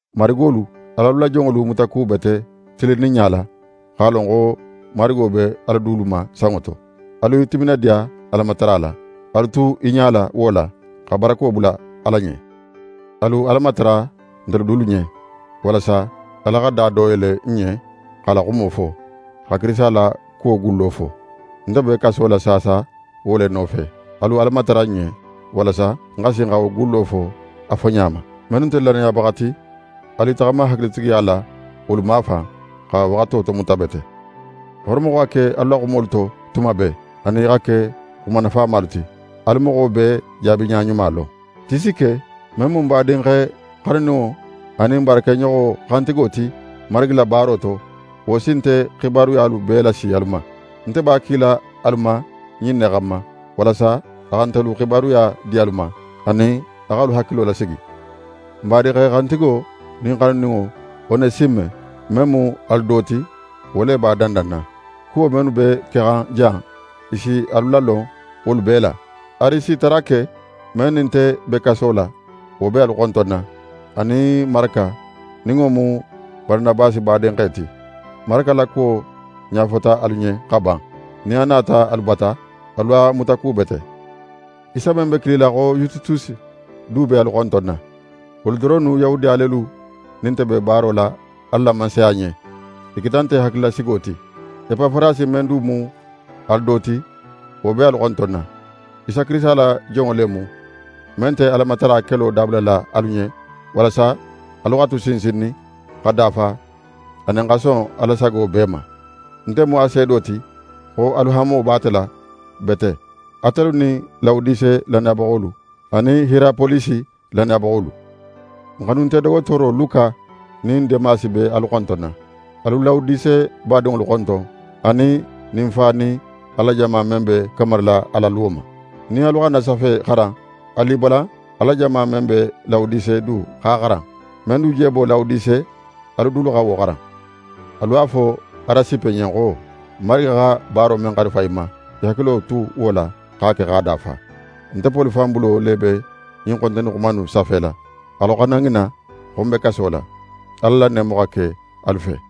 Marigolu, al'alu la jonŋolu mutakubete tilinninɲa la, x'a lon xo Marigo be alu dulu ma sanŋo to. Alu i timinadiya Alamatara la. Alu tu i ɲala wo la, xa barako bula Ala ɲen. Alu Ala matara ntelu dulu ɲen, walasa Ala xa da do yele n ɲen x'a la xumo fo, xa Kirisita la kuwo gullo fo. Nte be kaso la saasa wo le nofe. Alu Ala matara ń ɲen walasa ń xa sin xa wo gullo fo a foɲa ma. Mennu nte lannayabaxa ti, alu i taxama hakilitigiya la wolu mafan, xa waxato tomuta bete. Horomo xa ke alu la xumolu to tuma bee, anin i xa ke xuma nafamalu ti. Alu moxo bee jaabiɲa ɲuma lon. Tisike, men mu n badinxe xanuninŋo anin n baarakeɲoxo xantigo ti Marigi la baaro to, wo si nte xibaruyalu bee lasi alu ma. Nte b'a kila alu ma ɲin ne xanma, walasa a xa ntelu xibaruya di alu ma, anin a x'alu hakilo lasigi. N badinxe xantigo nin xanuninŋo, Onesime, men mu alu do ti, wo le b'a dandanna. Kuwo mennu be kexan jan, i si alu lalon wolu bee la. Arisitarake, men nin nte be kaso la, wo be alu xontonna, anin Maraka, nin wo mu Baranabasi badinxe ti. Maraka la kuwo ɲafota alu ɲen xa ban: Nin a nata alu bata, alu a mutakubete. Isa men be kilila xo Yusitusi du be alu xontonna. Wolu doronnu Yahudiya lelu nin nte be baaro la Ala la Mansaya ɲen. I keta nte hakililasigo ti. Epafarasi men du mu alu do ti, wo be alu xontonna. Isa Kirisita la jonŋo le mu, men nte Alamatara kelo dabulala alu ɲen walasa alu xa tu sinsinnin, xa dafa anin xa son Ala sago bee ma. Nte mu a seedo ti xo alu hanmo b'a la bete, atelu nin Lawodise lannayabaxolu anin Hiyerapolisi lannayabaxolu. N xanunte dogotooro Luka nin Demasi be alu xontonna. Alu Lawodise badinŋolu xonton, anin Ninfa nin Ala la jama men be kamarila a la luwo ma. Nin alu xa ń na safe xaran, alu i balan Ala la jama men be Lawodise du x'a xaran. Men du je bo Lawodise, alu dulu xa wo xaran. Alu a fo Arasipe ɲen xo: «Marigi xa baaro men xarifa í ma, í hakilo tu wo la, x'a ke x'a dafa.» Nte Poli fan bulo le be ɲin xontonni xuma innu safela: Alu xana ŋina xo ń be kaso la. Ala la neemo xa ke alu fe.